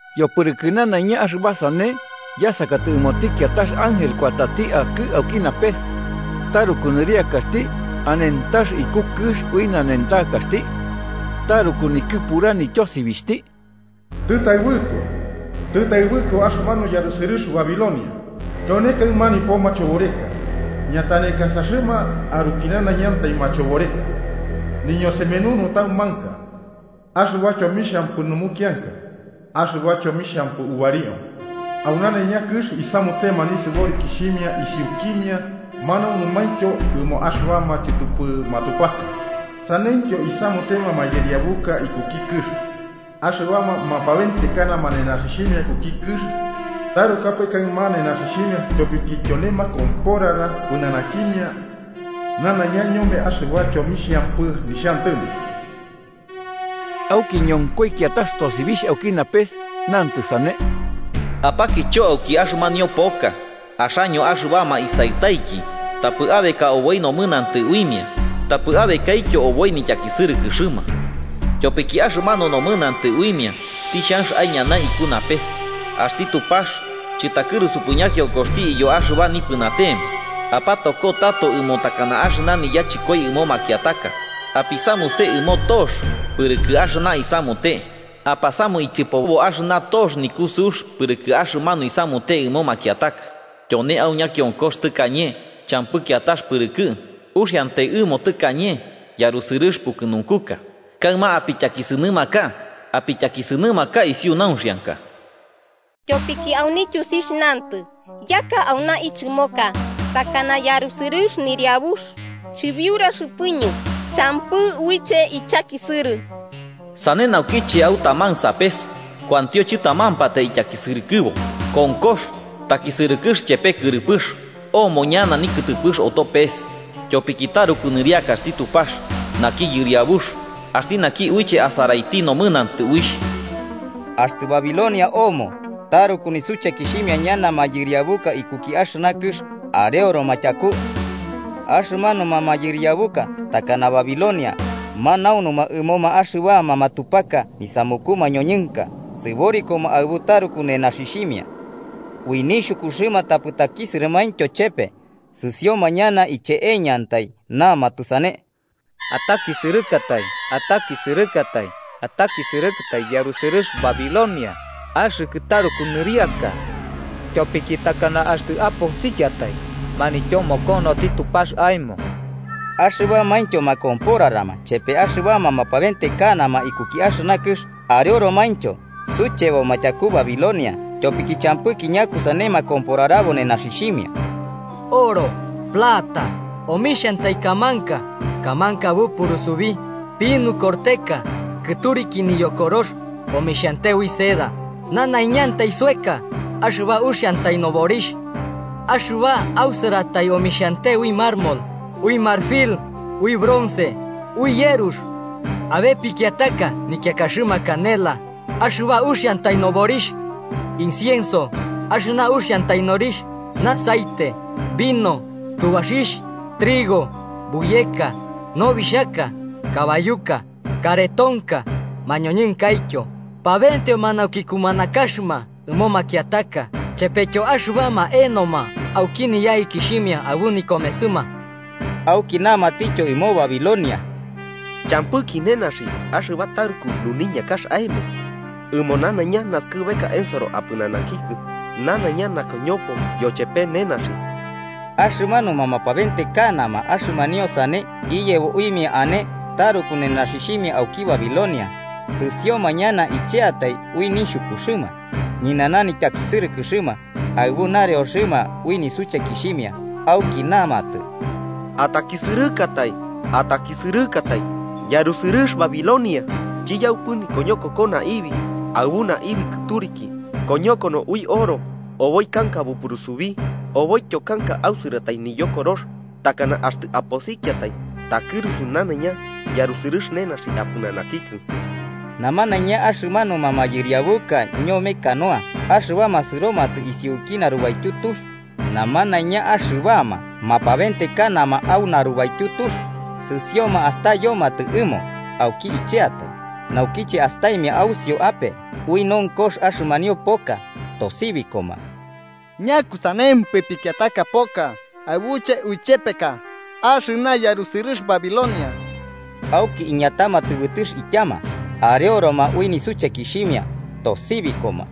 Yopɨrɨkɨ nanaiña axɨba sane, yasakatɨ ɨmoti kiatax ángel kuatati akɨ auki napes. Taruku nɨriakaxti, anentax iku kɨx ui nanentakaxti. Taruku nikɨpura nityosibixhti: “¡Tɨtaɨbɨko, tɨtaɨbɨko axɨmanu yarusɨrɨx Babilonia! ¡Tyone kaɨma nipo machoboreka, ñatanekasaxɨma arukinanaiñantai machoboreka, niñosemenu nutaumanka axɨba chomixhampɨ numukianka axɨba chuxiampɨ ubario! Au nanaiña kɨx isamutema nisɨborikixhimia isiukimia manaunumaintyo ɨmo axɨbama chɨtɨpɨ matupaka. Saneityo isamutema mayɨriabuka ikuki kɨx. Axɨbama mapabentekanama nenaxixhimia ikuki kɨx tarukapae kaɨma nenaxixhimia tyopiki tyone makomporara pɨnanakimia nanaiña ñome axɨba chomixhampɨ nixhantɨmo.” Auki ñonkoi kiatax tosibixh auki napes, nantɨ sane: “Apakicho auki axɨmanio poka, axaño axɨbama isaɨtaiki, tapɨ abeka oboi nomɨnantɨ uimia tapɨ abekaityo oboi nityakisɨrɨkɨxɨma. Tyopiki axɨmanu nomɨnantɨ uimia tixhanx aiñanai iku napes, axti Tupax chɨtakɨrusupɨ ñakionkoxti iyo axɨba nipɨnatema. Apatoko tato ɨmo takana axɨna niyachɨkoi ɨmo makiataka. apisamuse ɨmo tox pɨrɨkɨ axɨna isamute. apasamu ityɨpobo axɨna tox nikusɨux pɨrɨkɨ axɨmanu isamute ɨmo makiataka. Tyone au ñakionkox tɨkañe champɨ kiatax pɨrɨkɨ, uxiantai ɨmo tɨkañe yarusɨrɨx pukɨnunkuka. Kaɨma apityakisɨnɨmaka apityakisɨnɨmaka isiu nauxianka. Tyopiki au nityusixh nantɨ ‘Yaka auna ichɨmoka takana yarusɨrɨx nɨniabux. Chɨbiuraxɨpɨñɨ, champɨ uiche ichakisɨrɨ.’ Sane naukiche au taman sapes kuantio chɨtamampatai ityakisɨrɨkɨbo: konkox, takisɨrɨkɨx chepe kɨrɨpɨx, omo ñana nikɨtɨpɨx oto pes. Tyopiki taruku nɨriakaxti Tupax, naki Yɨriabux axti naki uiche asaraiti nomɨnantɨ uixh.” Axtɨ Babilonia omo taruku nisuchekixhimia ñana mayɨriabuka ikuki axɨna kɨx areoroma tyaku. Axɨmanuma mayɨriabuka takana Babilonia, manaunuma ɨmoma axɨbama matupaka nisamuku mañoñɨnka sɨborikoma aɨbu taruku nenaxixhimia. Ui nixhukuxɨma tapɨ takisɨrɨmaintyo chepe, sɨsioma ñana icheeñantai namatɨ sane: “¡Atakisɨrɨkatai, atakisɨrɨkatai, atakisɨrɨkatai yarusɨrɨx Babilonia, axɨkɨ taruku nɨriaka! Tyopiki takana axtɨ aposikiatai manityomokonoti Tupax aemo.” Axɨbamaintyo makomporarama chepe axɨbama mapabentekanama ikuki axɨna kɨx areoromaintyo sucheboma tyaku Babilonia tyopiki champɨki ñakusane makomporarabo nenaxixhimia: oro, plata, omixhiantai kamanka, kamanka bupurusubi, pinu korteka kɨturiki niyokorox omixhante ui seda, nanaiñantai soeka axɨba uxiantai noborixh. Axɨba ausɨratai omixhante ui mármol, ui marfil, ui bronce, ui yerux. Abe pikiataka nikiakaxɨma canela, axɨba uxiantai noborixh. Incienso, axɨna uxiantai norixh, aceite, vino, tubaxixh, trigo, buyeka, nobixhaka, kabayuka, karetonka, mañoñɨnkaityo pabenteoma nauki kumanakaxɨma ɨmo makiataka chepetyo axɨbama enoma auki niyaikixhimia aɨbu nikomesɨma. Auki namatityo ɨmo Babilonia: “¡Champɨki nenaxi axɨba taruku nuniñakax aemo. Ɨmo nanaiña naskɨbeka ensoro apɨnanakikɨ nanaiña nakoñopo yochepe nenaxi!” Axɨmanuma mapabentekanama axɨmanio sane iyebo uimia ane taruku nenaxixhimia auki Babilonia, sɨsioma ñana icheatai ui nixhukuxɨma, ñɨnana nityakisɨrɨkɨxɨma, aɨbu nareoxɨma ui nisuchekixhimia, auki namatɨ: “¡Atakisɨrɨkatai, atakisɨrɨkatai yarusɨrɨx Babilonia! Chiyaupɨ nikoñokoko naibi, aɨbu naibi kɨturiki, koñokono ui oro, oboi kanka bupurusubi oboityo kanka ausɨratai niyokorox. ¡Takana axtɨ aposikiatai takɨrusu nanaiña yarusɨrɨx nenaxi apɨnanakikɨ!” Namanaiña axɨmanuma mayɨriabuka ñome canoa axɨbama sɨromatɨ isuki narubaityu tux, namanaiña axɨbama mapabentekanama au narubaityu tux sɨsioma astayomatɨ ɨmo auki icheatai naukiche astaimia ausiu ape ui nonkox axɨmanio poka, tosibikoma: “¿Ñakusanempɨ pikiataka poka aɨbuche uichepeka axɨna yarusɨrɨx Babilonia?” Auki iñatama tɨbɨtɨx ityama, areoroma ui nisuchekixhimia, tosibikoma: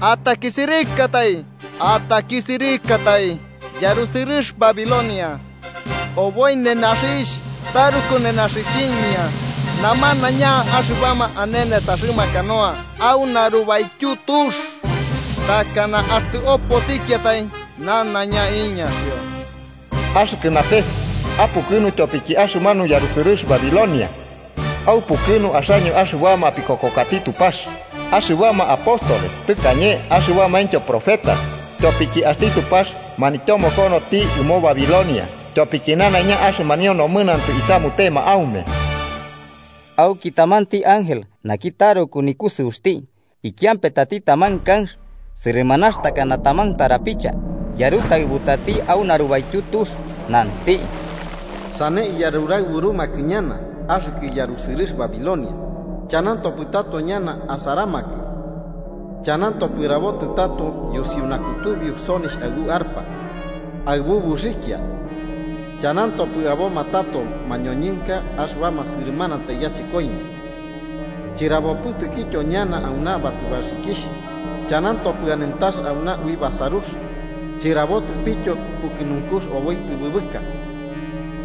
“¡Atakisɨrɨkatai, atakisɨrɨkatai yarusɨrɨx Babilonia! Oboi nenaxixh taruku nenaxixhimia namanaiña axɨbama ane nesaxɨma canoa au narubaityu tux. ¡Takana axtɨ oposikiatai nanaiña iñaxio!” Axɨkɨ napes, apukɨnu tyopiki axɨmanu yarusɨrɨx Babilonia. Aupukɨnu axaño, axɨbama apikokokati Tupax, axɨbama apóstoles tɨkañe axɨbamaintyo profetas, tyopiki axti Tupax, manityomokonoti ɨmo Babilonia tyopiki nanaiña axɨmanio nomɨnantɨ isamutema aume. Auki tamanti ángel naki taruku nikusɨuxti, ikiampetati taman kanx, sɨrɨmanax takana taman tarapicha, yarutaɨbutati au narubaityu tux nanti: “Sane iyaruraɨburumakɨ ñana, axɨkɨ yarusɨrɨx Babilonia, chanantopɨ tato ñana asaramakɨ. Chanantopɨ rabotɨ tato yusiu nakutubiu sonixh aɨbu arpa, aɨbu buxikia, chanantopɨ aboma tato mañoñɨnka axɨbama sɨrɨmanatai yachɨkoimia, chɨrabopɨtɨkityo ñana auna batubaxikixh. Chanantopɨ anentax auna ui basarux, chɨrabotɨpityo pukɨnunkux oboi tɨbɨbɨka.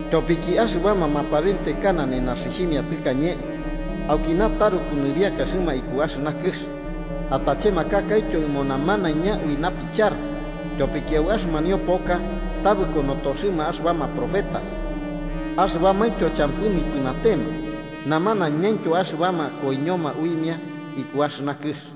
Tyopiki axɨbama mapabentekana nenaxixhimia tɨkañe aukina taruku nɨriakaxɨma iku axɨna kɨx, atachemakakaityo ɨmo namanaiña ui napichara.” Tyopiki au axɨmanio poka tabɨko notoxɨma axɨbama profetas axɨbamaintyo champɨ nipɨnatema, namanañaintyo axɨbama koiñoma uimia iku axɨna kɨx.